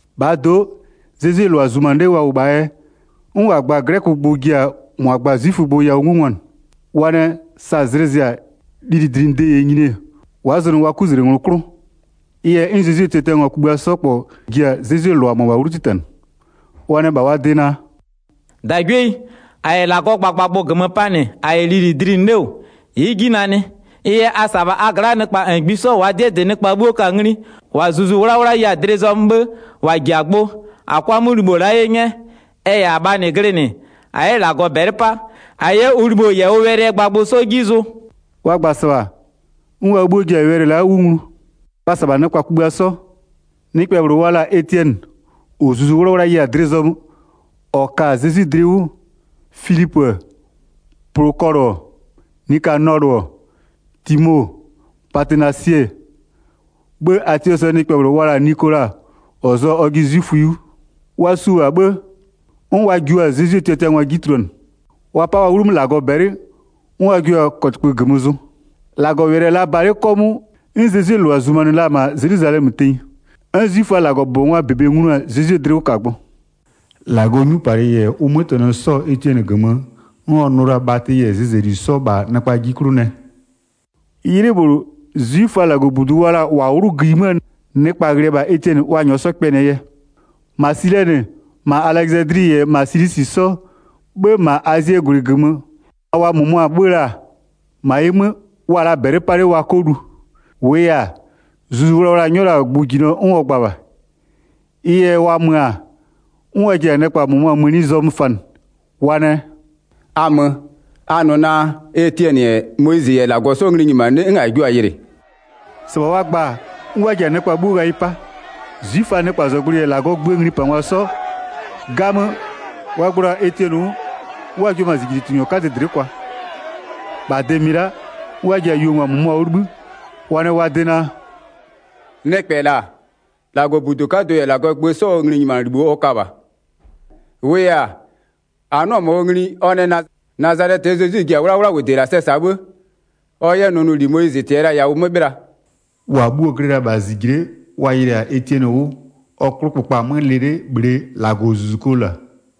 1-Bhaa do'o, Zezwie -lʋa zumanɩ 'le wa -wʋ -bhaa yɛ, 'n -wa gba-a 'glɛkögbʋ ji-a -mʋa gba-a 'zwifögbʋ yawʋ 'ngungwanɩ. Wa nɛ, sa zlɩ zɩ-a, lilidlinɩde -yɛ nyini-e, wa'a zʋnʋ wa -nɩ 'kuzlengwlɩ 'klʋ. Ɩ yɛ, 'n Zezwie tiatiangwa kugbïa 'sɔ -kpɔ ji-a Zezwie -lʋa mʋabha 'wlu 'titanɩ. Wa nɛ -bha wa de naa: “-Dagwieyi, -a -yɛ -Lagɔgbʋ -gömö 'panɩ -a -yɛ lili dlinɩ 'le -wʋ, ɩ'ɩ 'ji nanɩ. Ɩ yɛ a -sa-a -bha a gla'a nɩkpa -ngbisɔ -waa 'dɩɛ -dɩ nɩkpa 'bhuo ka-a ngli, -wa Zuzu 'Wlawla ye-a dlɩ zɔmö, 'bhë -wa -ji-a gbʋ, -a 'kʋa 'mʋ libho -la 'ye 'nyɛ. Ɛ -yɛ -abhaa -nɩ glɩnɩ-ɛ, -a 'yɛ -Lagɔ -bɛlɩ 'pa, -a 'yɛ ʋ -libho -yɛ ʋ wɛlɩɛ gbagbʋ 'sɔ 'ji zʋ.” Wa gba-a -sɩbha, 'n wa 'bhuo ji-a wɛlɩ la'a 'wʋ nglu. Wa -sa-a -bha nɩkpa -ngbisɔ. Nɩkpɛ -bhlʋ wa la-a Etiɛnɩ, -ɔ Zuzu 'Wlawla ye-a dlɩ zɔmö 'n ɔ ka-a Zezwi dlɩ 'wʋ, Filipö-ö Plokɔlʋ-ɔ, Nikanɔlʋ-ɔ, Timo-o, Patenasɩ-ɛ, 'bhë Atiɔsɩɛ nɩkpɛ wa la-a Nikola -ɔ zʋa-a ɔjɩ 'zwiföyi 'wʋ. Wa -sʋa-a -bha 'bhë, 'n wa jua-a Zezwie tiatiangwa 'ji tuluanɩ. Wa 'pa-a wa 'wlumö -Lagɔ -bɛlɩ, 'n wa jua-a kɔtɩkpö -gömö zʋ. 7-Lagɔwɛlɩ-ɛ la ba 'le 'kɔmʋʋ, 'n Zezwie -lʋa zumanɩ la-a -ma Zelwizalɛmö tenyi. 'N 'zwiföaa -Lagɔbʋbɔngwaa -bebe nglu-a Zezwie dlɩwʋkagbʋ. 'Zwiföaa 'kadɩ yɛ Etiɛnɩ -zijle tunʋ 8-Lagɔɔ 'nyupalɩ -yɛ ʋ 'mötɛnɔ 'sɔ-ɔ Etiɛnɩ -gömö, 'n ɔ nʋ la-a bhatɩ -yɛ zɩzɛli 'sɔ -bha nɩkpa 'ji 'klʋ nɛ. 'Ylɩ -bhlʋ, 'zwiföa -Lagɔbudu wa la-a -wa 'wlʋ gïyi 'möö nɩkpa ghlɩ-ɛ -bha Etiɛnɩ wa -nyɔɔ 'yɛ kpɛnɩɛ yɛ. -Ma Silɛnɩ, -ma Alɛzadli -yɛ -ma Silisi 'sɔ, 'bhë -ma Azie -gwlɩ -gömö, -ma wa -mʋmʋa 'bhö-ö la -bha. 10-Ma ɩ 'mö, wa'a la bhɛlɩ wa 'kɔ lu. -Wʋʋ yɛ-a, Zuzu Wlawla-a nyɔ la-a gbʋjinɔ 'n ɔ gba -bha. Ɩ yɛ, wa mö-a, 'n wa ji-a nɩkpa -mʋmʋa mëni zɔmö fanɩ. Wa nɛ: “A mö, a nʋ naa: Etiɛnɩ-ɛ Moyizɩ -yɛ -Lagɔ 'sɔ ngli nyimanɩ 'le, 'n a jio-a yɩlɩ.” 12-Sɩbha wa gba-a, 'n wa ji-a nɩkpa 'bhuo ghayɩ 'pa. 'Zwiföaa nɩkpazɔgblʋɩ -yɛ -Lagɔɔ gböö nglipangwa 'sɔ. 'Gamö, wa gblo-a Etiɛnɩ 'wʋ, 'n wa jio-o -ma -zijlitungwa 'kadɩ dlɩ'ɩ kwa. 13-Bha de -mɩ la'a, 'n wa ji-a yuongwa -mʋmʋa 'wʋ 'libhï, wa nɛ wa nʋ naa: “Nɩkpɛ la'a, -Lagɔbudu 'kadʋ -yɛ -Lagɔɔ gbö 'sɔɔ nglinyimanɩlibho ɔ ka -bha. 14-Wʋʋ yɛ-a, -a 'nʋ-ɔ -ma ɔ ngli, ɔ nɛ naa: Nazalɛtɩyi Zezwi-i ji-a 'wlawlawʋde -la sɛ -sa 'bhë ɔ 'yɛ nʋnʋli Moyizɩ -tɩya la-a yawʋ 'mö 'bhɩla.” 15-Wa bhuo-o glɩ la-a -bha -zijle'e, wa yɩlɩ-a Etiɛnɩ 'wʋ, ɔ 'klʋkpökpa-a 'mö lɩ 'le -bhlee -Lagɔzuzukoo -la.